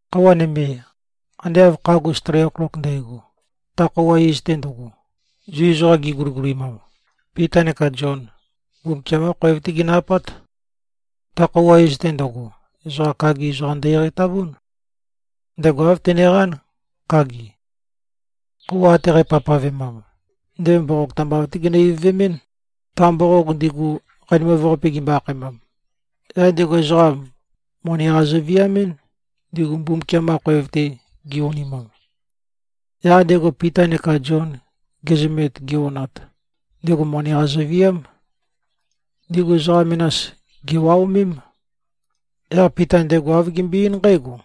Khøuwa nøme, ande av khagus tri oklok ndægo, ta khøuwa iz-te ndøgo, Zu ezoqam giguligulimam, Pita neka Zion, Mbumbukiam-qá khoev-té ginø-apát. Ta khøuwa iz-te ndøgo, ezoqa kagi ezoqam ndø-eqeitavún. Ndego āv teneqán, kagi. Khøuwa ate qæpavpavemam, ndego mboqog tambav-té ginø-ivøvemɨ́n, ta mboqog ndigu, Qanimav-Qape gimbo-akhaemam. Yaq ndego ezoqa moni-qa zøviamɨ́n, ndigu Mbumbukiam-qa khoev-te gi-onimam. Yaq ndego Pita neka Zion gezømet, gi-onat, ndego moni-qa zøviám. Ndigu ezoqa menas, gèwaomém. Yaq Pita ndego āv gembøe-eín nqǽgo,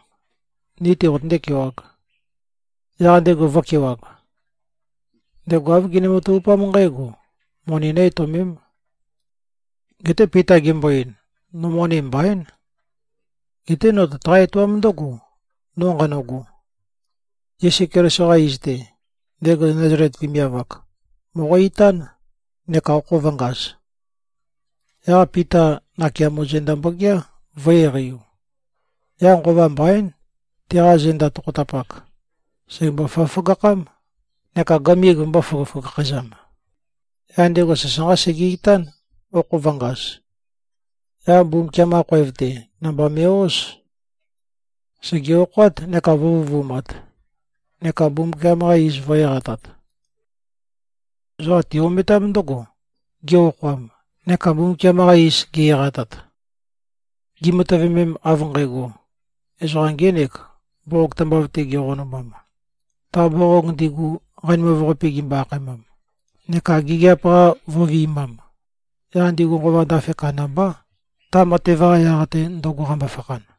“Ni-tē qotøndé-kewāg.” Yaq ndego vø̄kewag. Ndego āv gene-matavupám nqǽgo: Moni nø̄-etøomēm. Geté Pita gembo-ein, “No moni mbaín. Geté no tøtaqá-etoám ndǿgo, no nqanøgo. Yesu Keliso-qa iz-te, ndego Nazalet vemiav-ak, mòqo-itán neka okho vø̄ngaz.” Yaq Pita nakeamo zenda mbogeá, vø̄-eqeiu. Yaq nqova mbaín, teqa zenda tokhotapak sègembo-føgøføgakhám neka gømig vømbō-føgøføgakhæzam. Yaq ndego sasanqá sege-itán, okho vø̄ngaz. Yaq Mbumbukiam-qa khoev-te, namba me꞉-óz. Sège-okhoát neka vø̄vøvumat, neka Mbumbukiam-qa iz vø̄-eqatat. Ezoqa ti-ometám ndǿgo, ge-okhoam neka Mbumbukiam-qa iz ge-eqatat. Gimatøvemem, av nqægo, ezoqa ngēnek, mboqog tambav-te geqonumam, ta mboqog ndigu Qanimav-Qape gimbo-akhaemam, neka gigiap-qa vø̄vi꞉mam, yaq ndigu nqova ndafe kandambá, ta matev-qa yaq-te, ndøgo qambo-fakhan.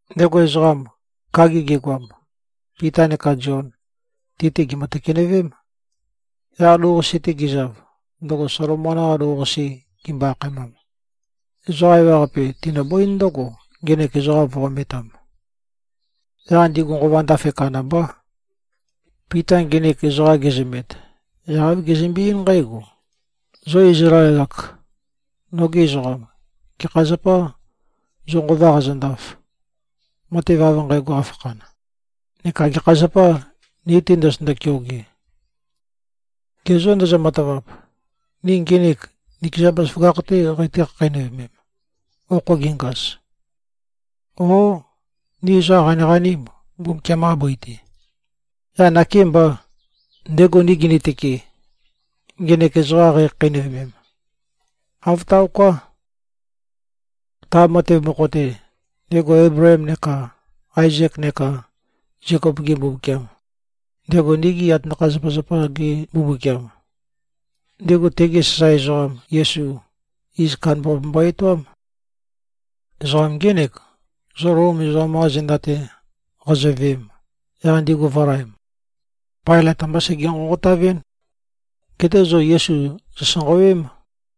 Ndego ezoqam, kagi gegoam, Pita neka Zion, ti-te gèmø-tøkenøvém. Yaq lou-qase-te gizav, ndøgo Solomon-qa Lou-Qase gimbo-akhaemam, ezoqa ewaqape tinøbǿin ndǿgo, ngenek ezoqam vø̄-ometam. Yaq ndigu nqova ndafe kandambá. Pita nginik ezoqa gezømet, yaq āv gezømbe-eín nqǽgo, “Zo Izlael-ak, nogi ezoqam. Gekha zapâ, zo nqova qazøndaf, matev av nqægo qafakhan? Neka gekha zapâ, ni-te ndozotøndo-keoge? Ge zô, ndozo-matavap, ni ngenek nikeza bazaføgakh-tē qeitǿ-khakheinøvemem, okho gengaz? Ó, ni ezoqam qaniqanîm, Mbumbukiam-qa bøi-te, yaq nakêmbà, ndego ni ginitøke, ngenek ezoqam qeikhakheinøvemem? Āv taoká! Ta matev mokho-te, ndego Eibleem neka Aezek neka Zekop-ge Mbumbukiam, ndego nigi atanakha-zapazapa-za-ge Mbumbukiam, ndego tege sasae ezoqam Yesu, iz kandambaqape mbo-etoám. Ezoqam ngének, zo Lom ezoqam-qa zenda-te qazoveem, yaq ndigu vø̄laem. Pailøt ambá sege-nqonqotavɨ́n. Geté zo Yesu zòsanqawém.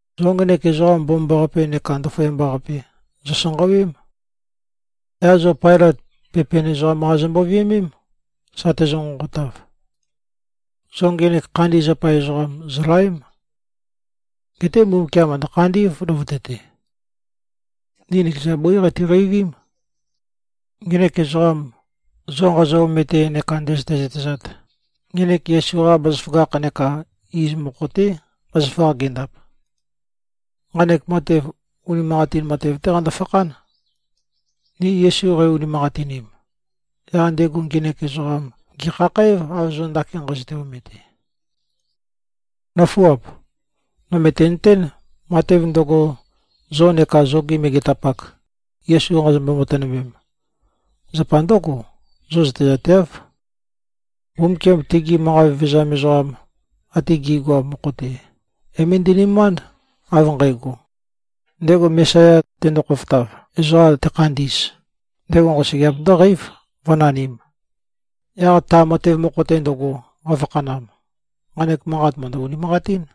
Zo ngenek Ezoqam Mbomambaqape neka Ndaføyamba-qape, zòsanqawém. Yaq zo Pailøt pepen ezoqam-qa zombo-viømém, sa tezø-nqonqotav. Zo ngenek khandi zapa ezoqam, zòlaém. Geté Mbumbukiam mø̀ndø-khandí꞉v, løvøte-te. Ni nikeza bǿi qatiqeivím. Ngenek ezoqam, zo nqazo-omete neka ndø̄zø̄tē-zø̄tēzāt, ngenek Yesu-qa bazaføgakh neka iz mokho-té, bazaføgakh gendap. Nqanek matev, unimanqatin matev-té qando-fakhán. Ni Yesu qei-unimanqatinim, yaq ndego ngenek ezoqam gèkhakhǽv, av zo ndakin nqazøte-omete. Nǿfuap. No mø̀tenøtén, matev ndøgo, zo neka zogi megetapak, Yesu qazombo-matønømem, zapa ndǿgo: Zo zøtezateáv. Mbumbukiam, tegi manqa vevezam ezoqam ate gi꞉goam mokho-te, é-møndi꞉nømánd, av nqægo, ndego Mesaya, tendo-khofotav, ezoqa tekhandi꞉z, ndego nqosøgeap ndǿqeív, vǿnanīm. Yaq ta matev mokho-te ndøgo, qafakhanam, nqanek manqat mø̀ndø-unimanqatín.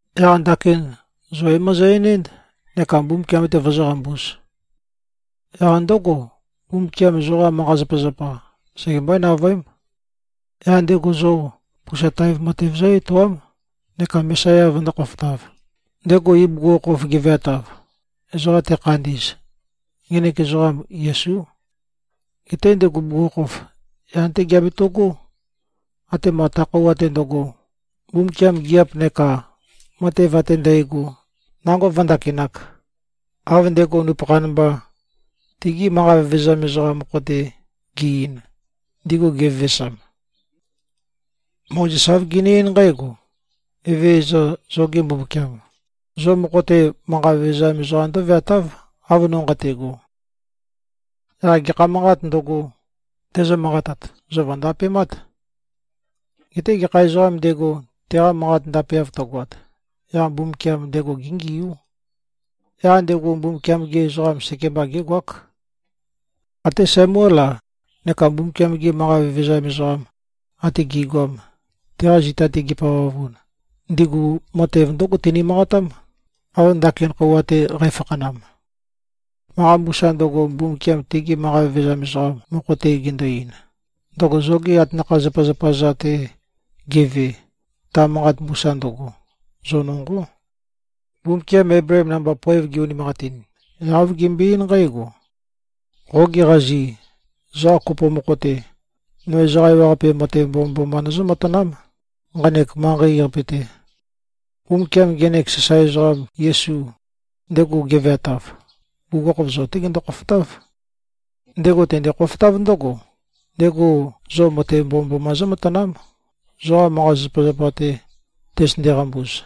Yaq ndakin, zo é-mozo-enénd neka Mbumbukiam-te vozóqambūz. Yaq ndǿgo, Mbumbukiam zoqa manqa-zapazapa, segembøé-navøém. Yaq ndego zo pusa taev matev zǿ-etoám, neka Mesaya vøndó-khofotāv, ndego ibugukhokhof geveatav, ezoqa tekhandi꞉z. Ngenek ezoqam, Yesú. Geté ndego bugukhokhof yan-té geabeto꞉gó, atema ta khøuwa-te ndøgo, Mbumbukiam gigiap neka matev ate ndægo nango vǿndakināk, av ndego nupøkhan mba, tegi manqa vevezam ezoqam mokho-te ge꞉-ein, ndigu gevevesam. Mozes āv gene-eín nqǽgo, ‘Evezøza, zoge Mbumbukiam, zo mokho-te manqa vevezam ezoqam ndǿveatáv, av no nqate꞉go. Yaq gekha manqāt ndøgo, tezø-manqatat, zo vø̀ndapemát. Geté gekha ezoqām ndego, teqa manqat ndapeav tøgoat, yaq Mbumbukiam ndego géngiú. Yaq ndego Mbumbukiam-ge ezoqam sekemba gégoák.’ Até Samuél-a, neka Mbumbukiam-gi manqa vevezam ezoqam ate gi꞉goam, teqa zita-te gipavavun, ndigu matev ndǿgo tini-manqatám, av ndakin khøuwa-te qæfakhanam. Manqa mbusa ndøgo, Mbumbukiam tegi manqa vevezam ezoqam mokho-te gendo-ein, ndøgo zogi atanakha-zapazapa-za-te geve, ta manqa mbusa ndøgo, zo nonqó. Mbumbukiam Eibleem namba, poev ge-unimanqatin, yaq āv gembøe-eín nqǽgo, ‘Qogi qazi, ezoqa kopo mokho-te, no ezoqa ewaqape matev mbomømboma nøzǿ-matanám, nqanek manqei-qape-te.’ Mbumbukiam ngenek sasae ezoqam Yesu, ndego geveatav, bugukhokhof zo-té gendo-khofotáv. Ndego tende-khofotáv ndǿgo, ndego zo matev mbomømboma zǿmatanám, zoqa manqa-zapazapa-te tøzøtønde-qambuz.”